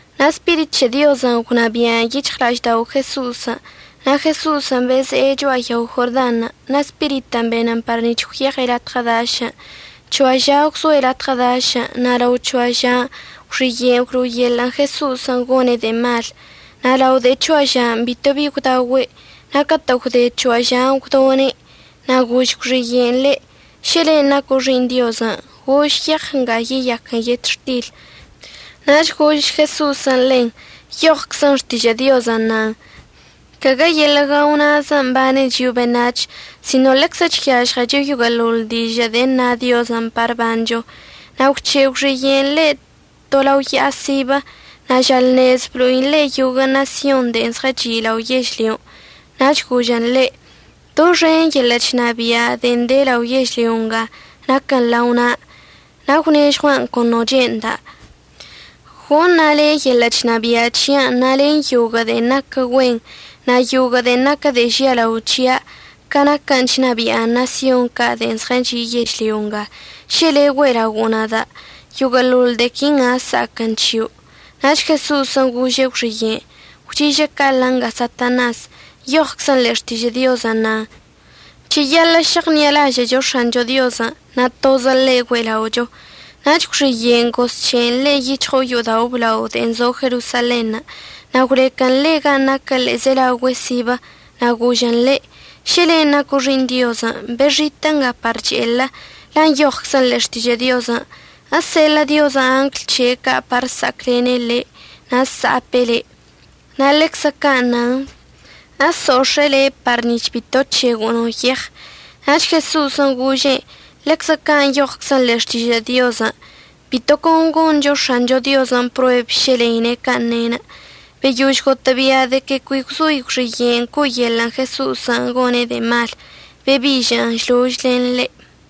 Na' Spirit c̱he Diozən' gwnabia'an yic̱hɉla'aždao' Jeso'osən'. Na' Jeso'osən' beze'e cho'a yao Jordanṉə', na' Spiritən' benən par nic̱h gwyeɉe' latɉə dašən'. C̱hoa ža gwzoe' latɉə dašən', na' lao c̱hoa žan' gwxiye'enə' gwlo'oyeḻə'ən Jeso'osən' gone' de'e malən'. Na' lao de'e c̱hoa žan' bitobi gwdaogüe', na' catə' gwde c̱hoa žan' gwdone'. Na' gož gwxiye'enə' ḻe': ―Šə len' naco' Xi'iṉ Diozən', gož yeɉ nga yeyaquən yetxtil. Nach gož Jeso'osən' ḻen: ―Nyoɉczə Xtižə' Diozən' nan: “Caguə yeḻə' guao na'azən' əbane chio'o beṉac̱h sino ḻeczə chyažɉecho yoguə'əḻoḻ dižə' de'e na Diozən' par əbancho.” Na' gwc̱he' gwxiye'enə' ḻe' to lao ya'a sibə, na' žalṉez blo'in ḻe' yoguə' ṉasyon de'e zɉəchi' lao yežlyon'. Nach gožən ḻe': ―Doxen yeḻə' chnabia' de'e de lao yežlyo nga naquən lao na'a. Na' əgwnežɉua'an con no che'enda'. Goṉa' le' yeḻə' chnabia' c̱hia'anə' na' len yoguə' de'en naquə güen na' yoguə' de'e naquə de'e žialao c̱hia' ca naquə chnabia'a ṉasyon ca' de'en zɉəchi' yežlyo nga. Šə le' güe'elaogo'o nada' yoguə'əḻoḻ de'e quinga əsa'aquən c̱hio'. Nach Jeso'osən' gože' gwxiye'enə': ―Gwchi'ižə' ca'aḻə nga, Satanas. Nyoɉczən ḻe'e Xtižə' Diozən' nan: “Cheyaḻə' šeɉṉi'alažə'əcho X̱ancho Diozən', na' tozə ḻe' güe'ela'ocho.” Nach gwxiye'enə' gozc̱he'en ḻe' yic̱hɉo'o yo'odao' əblao de'en zo Jerosalenṉə', na' gwlequən ḻe' gan' naquə ḻe'ezelaogüe sibə, na' gožen ḻe': ―Šə len' naco' Xi'iṉ Diozən' bexitə' nga par che'elə, la' nyoɉczən ḻe'e Xtižə' Diozən': Eseḻə' Diozən' angl c̱he' ca' par əsa'aclene' le' na' əsa'ape' le'. Na' ḻeczə ca' nan: Eso'ox̱e'e le' par nic̱h bito əc̱hego'o no yeɉ. Nach Jeso'osən' gože'en: ―Ḻeczə ca' nyoɉczən ḻe'e Xtižə' Diozən': “Bito con goncho X̱ancho Diozən' prueb šə ḻeine' can' ne'enə'.” Beyož gotə'əbia' de que cui gwzoi gwxiye'enə' co'oyeḻə'ən Jeso'osən' gone' de'e malən', bebi'ižə'ən šlož len ḻe'.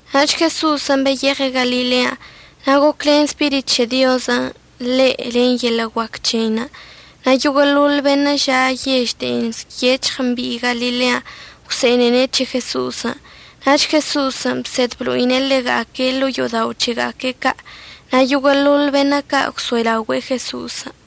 Nach Jeso'osən' beyeɉe' Galilean', na' goclen Spirit c̱he Diozən' ḻe' len yeḻə' guac c̱heinə'. Na' yoguə'əḻoḻ beṉə' ža' yež de'en nyec̱hɉ mbi'i Galilean' gwse'enene' c̱he Jeso'osən'. Nach Jeso'osən' bsed blo'ine' ḻega'aque' ḻo'o yo'odao' c̱hega'aque' ca' na' yoguə'əḻoḻ beṉə' ca' gwso'elaogüe'e Jeso'osən'.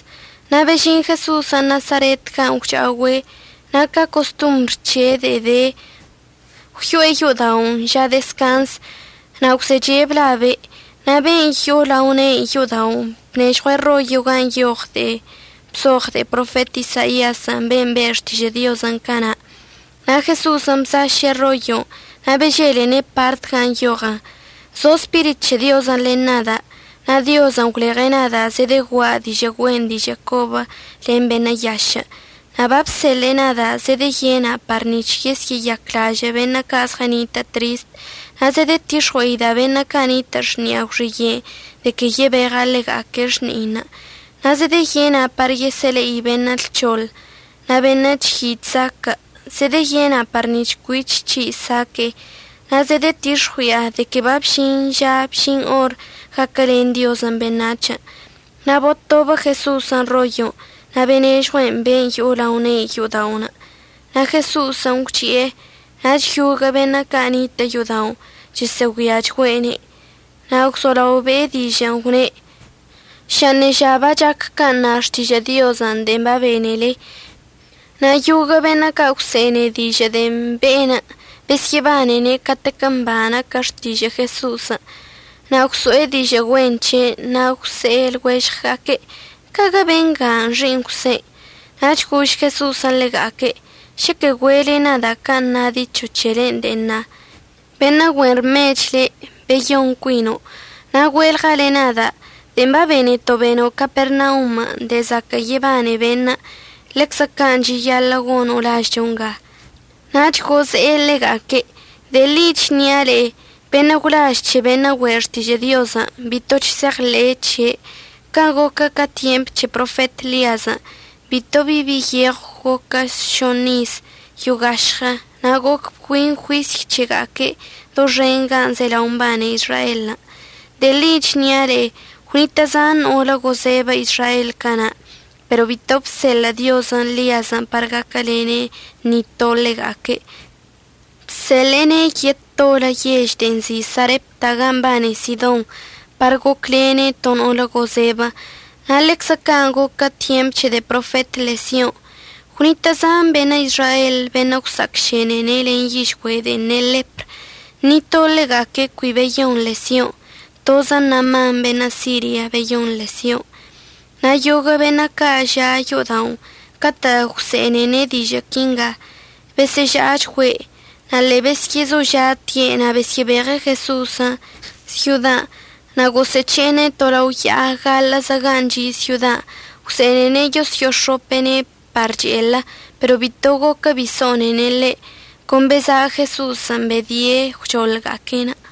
Na' bežin Jeso'osən' Nasaret gan' gwcha'ogüe', na' ca costombr c̱he' de'e de, gwyo'e yo'oda'onə' ža dezcanzən' na' gwzeche' blabe'. Na' ben' yo'o lao ne'i yo'oda'onə' bnežɉue'ene' rollo gan' nyoɉ de'en bzoɉ de'e profet Isaiazən', ben' be' xtižə' Diozən' cana'. Na' Jeso'osən' bsaše' rollon' na' beželene' partən' gan' nyoɉən: Zo Spirit c̱he Diozən' len nada', na' Diozən' gwleɉe' nada' zedegua'a dižə' güen dižə' cobə len beṉə' yašə'. Na' babseḻe'e nada' zedeyena' par nic̱h yesyə'əyaclažə' beṉə' ca' zɉənitə' trist. Na' zedətix̱ɉue'ida' beṉə' ca' nitə' xni'a gwxiye'enə' de que yebeɉa' ḻega'aque' xni'einə'. Na' zedeyena' par yesə'əle'i beṉə' lc̱hoḻ, na' beṉə' chyi' chzaquə', zedeyena' par nic̱h cuich c̱hi' saque'e. Na' zedetix̱ɉui'a de que babžin ža bžin or gaquəlen Diozən' beṉac̱hən'. Na' botobə Jeso'osən' rollon' na' benežɉue'en ben' yo'o lao ne'i yo'oda'onə', na' Jeso'osən' gwchi'e. Nach yoguə' beṉə' ca' nitə' yo'oda'onə' chosə'əgüiachgüe'ene'. Na' gwzolao be'e dižə'ənə', gwne': ―Ža ṉeža bachac can' na Xtižə' Diozən' de'en babenele. Na' yoguə' beṉə' ca' gwse'ene dižə' de'en be'enə' besyə'əbanene' catec mba naquə xtižə' Jeso'osən', na' gwso'e dižə' güen c̱he'enə'. Na' gwse' lɉuežɉga'aque': ―¿Ecaguə bengan' xi'iṉ Jwsen'? Nach gož Jeso'osən' ḻega'aque': ―Šəquə güe'ele nada' can' na dicho c̱helen' de'en na: “Beṉə' güen rmech le', beyon cuino'.” Na' güe'elɉale nada': “De'en babeneto' beno' Capernaum de'e zaquə' yebane beṉə', ḻeczə can' cheyaḻə' gono' lažcho nga.” Nach goze'e ḻega'aque': ―De'e ḻi chnia' le'e, beṉə' gwlaž c̱he beṉə' güe' xtižə' Diozən' bito chse'eɉḻe'e c̱he'. Can' goquə ca tyemp c̱he profet Ḻiazən' bito bi bi yeɉw goquə šoṉ iz yo'o gašɉə, na' goc bgüin juisy c̱hega'aque' doxen gan' zelao mbane Izraelən'. De'e ḻi chnia' le'e, gwnitə' zan no'olə gozebə Izraelən' cana'. Pero bito bseḻə' Diozən' Ḻiazən' par gaquəlene' ni to ḻega'aque'. Bseḻe'ene' yetolə yež de'en nzi' Sarepta ga mbane Sidon par goclene' to no'olə gozebə. Na' ḻeczə can' goquə tyemp c̱he de'e profet Ḻesion' gwnitə' zan beṉə' Izraelən' beṉə' gwsa'acšene len yižgüe' de'en ne' ḻepr. Ni to ḻega'aque' cui beyon Ḻesion'. Tozə Naaman beṉə' Siria beyon Ḻesion'. Na' yoguə' beṉə' ca' ža' yo'oda'onə' catə' gwse'enene' dižə' quinga besə'əža'achgüe'. Na' ḻe'e besyə'əzoža'ate' na' besyə'əbeɉe' Jeso'osən' syodan' na' gosə'əc̱he'ene' to lao ya'a gaḻə'əzə gan' chi' syodan' gwse'ene'ene' yoso'ox̱ope'ene' par che'elə, pero bito goquə bi so'onene' ḻe'. Con beza' Jeso'osən' bedie' gwchoḻga'aque'enə'.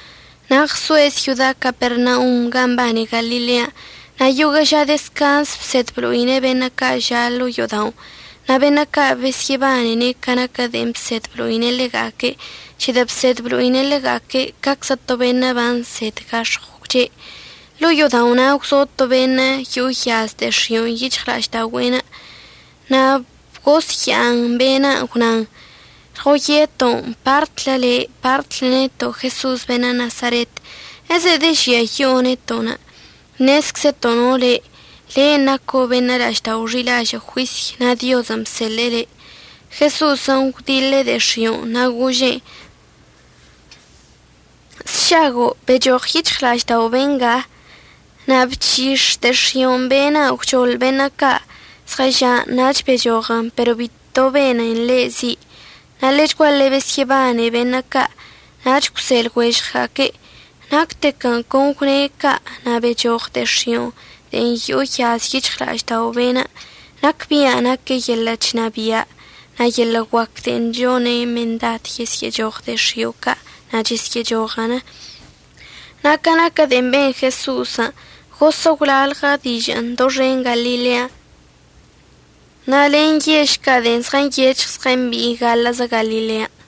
Na' ɉsoe' syoda Capernaum gan' mbane Galilean'. Na' yoguə' ža dezcanzən' bsed blo'ine' beṉə' ca' ža' ḻo'o yo'oda'onə'. Na' beṉə' ca' besyə'əbanene' ca naquə de'en bsed əblo'ine' ḻega'aque' c̱hedə' bsed blo'ine' ḻega'aque' ca'aczə to beṉə' bansed gax̱ɉw gwche'. Ḻo'o yo'odao' na' gwzo to beṉə' yo'o yaz de'e x̱io' yic̱hɉla'aždaogüe'enə'. Na' bgosya'an be'enə' gwnan: ―Lɉoyeto'onə'. Partlə le', partlə neto' Jeso'os beṉə' Nasaret. ¿Ezedežiayi'o neto'onə'? Ṉezczəto' no le': Le' naco' beṉə' la'aždao' xi'ilažə' juisy na' Diozən' bseḻe'e le'. Jeso'osən' gwdiḻe' de'e x̱i'onə' na' gože'en: ―Sšago'. Bechoɉ yic̱hɉla'aždao' benga. Na' bchix̱ de'e x̱i'onə' be'enə' gwchoḻ beṉə' ca' zɉəža'anə' nach bechoɉən, pero bito benen ḻe' zi'. Na' ḻechguaḻe besyə'əbane beṉə' ca' nach gwse' lɉuežɉga'aque': ―Nactequən' con gwne' ca' na' bechoɉ de'e x̱i'onə' de'en yo'o yaz yic̱hɉla'aždao' be'enə'. Nacbia' nape' yeḻə' chnabia' na' yeḻə' guac de'en chone' mendad yesyə'əchoɉ de'e x̱io' ca' na' chesyə'əchoɉən. Na' ca naquə de'en ben Jeso'osən' gosə' gwlalɉə dižə'ənə' doxen Galilean', na' len yež ca' de'en zɉənyec̱hɉ zɉəmbi'i gaḻə'əzə Galilean'.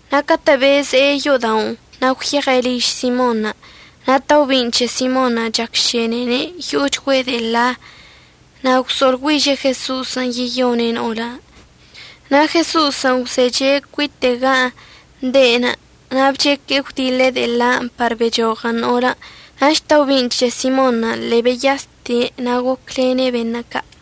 Na' catə' beze'e yo'oda'onə', na' gwyeɉe' liž Simonṉə'. Na' taobin' c̱he Simonṉə' chacšenene' yo'ochgüe' de'e ḻa na' gwso'oḻgüiže' Jeso'osən' yeyone' no'olən'. Na' Jeso'osən' gwzeche' cuite' gan' de'enə' na' bcheque'e gwdiḻe' de'e ḻanə' par bechoɉən no'olən'. Nach taobi'in c̱he Simonṉə' ḻe'e beyaste' na' goclene' beṉə' ca'.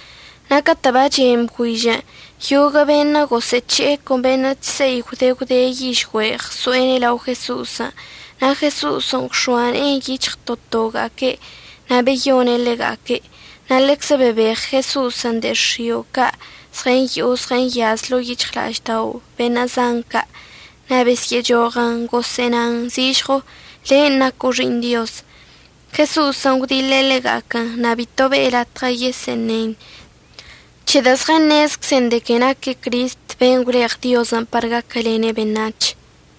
Na' catə' bachen bgüižən', yoguə' beṉə' gosə'əc̱he'e con beṉə' chse'i gwde gwde yižgüe' ɉso'ene' lao Jeso'osən'. Na' Jeso'osən' gwx̱oa ne'en yic̱hɉ to toga'aque' na' beyone' ḻega'aque'. Na' ḻeczə bebeɉ Jeso'osən' de'e x̱io' ca' zɉəyo'o zɉəyaz ḻo'o yic̱hɉla'aždao' beṉə' zan ca'. Na' besyə'əchoɉən gosə'ənan zižɉo: ―Len' naco' Xi'iṉ Diozən'. Jeso'osən' gwdiḻe' ḻega'aquən na' bito be'e latɉə yesə'əṉen c̱hedə' zɉəṉezczen de que naque' Cristən' ben' gwleɉ Diozən' par gaquəlene' beṉac̱hən'.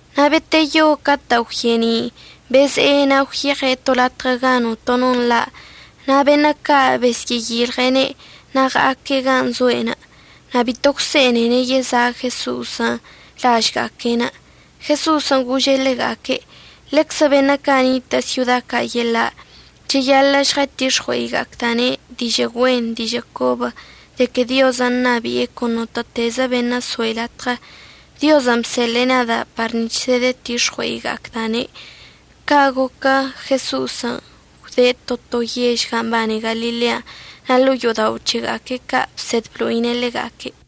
Na' beteyo catə' gwye'eni', beze'e na' gwyeɉe' to latɉə gan' notono nḻa'. Na' beṉə' ca' besyə'əyilɉe'ene' na' ɉa'aque' gan' zoe'enə'. Na' bito gwse'enene' yeza' Jeso'osən' lažga'aque'enə'. Jeso'osən' gože' ḻega'aque': ―Ḻeczə beṉə' ca' nitə' syoda ca' yeḻa' cheyaḻə' žɉətix̱ɉue'iga'acda'ane' dižə' güen dižə' cobən' de que Diozən' ṉabi'e con notə'ətezə beṉə' əsoe' latɉə. Diozən' bseḻe'e nada' par nic̱h žɉətix̱ɉue'iga'acda'ane'. Ca' goquən' Jeso'osən' gwde' to to yežən' gan' mbane Galilean' na' ḻo'o yo'odao' c̱hega'aque' ca' bsed blo'ine' ḻega'aque'.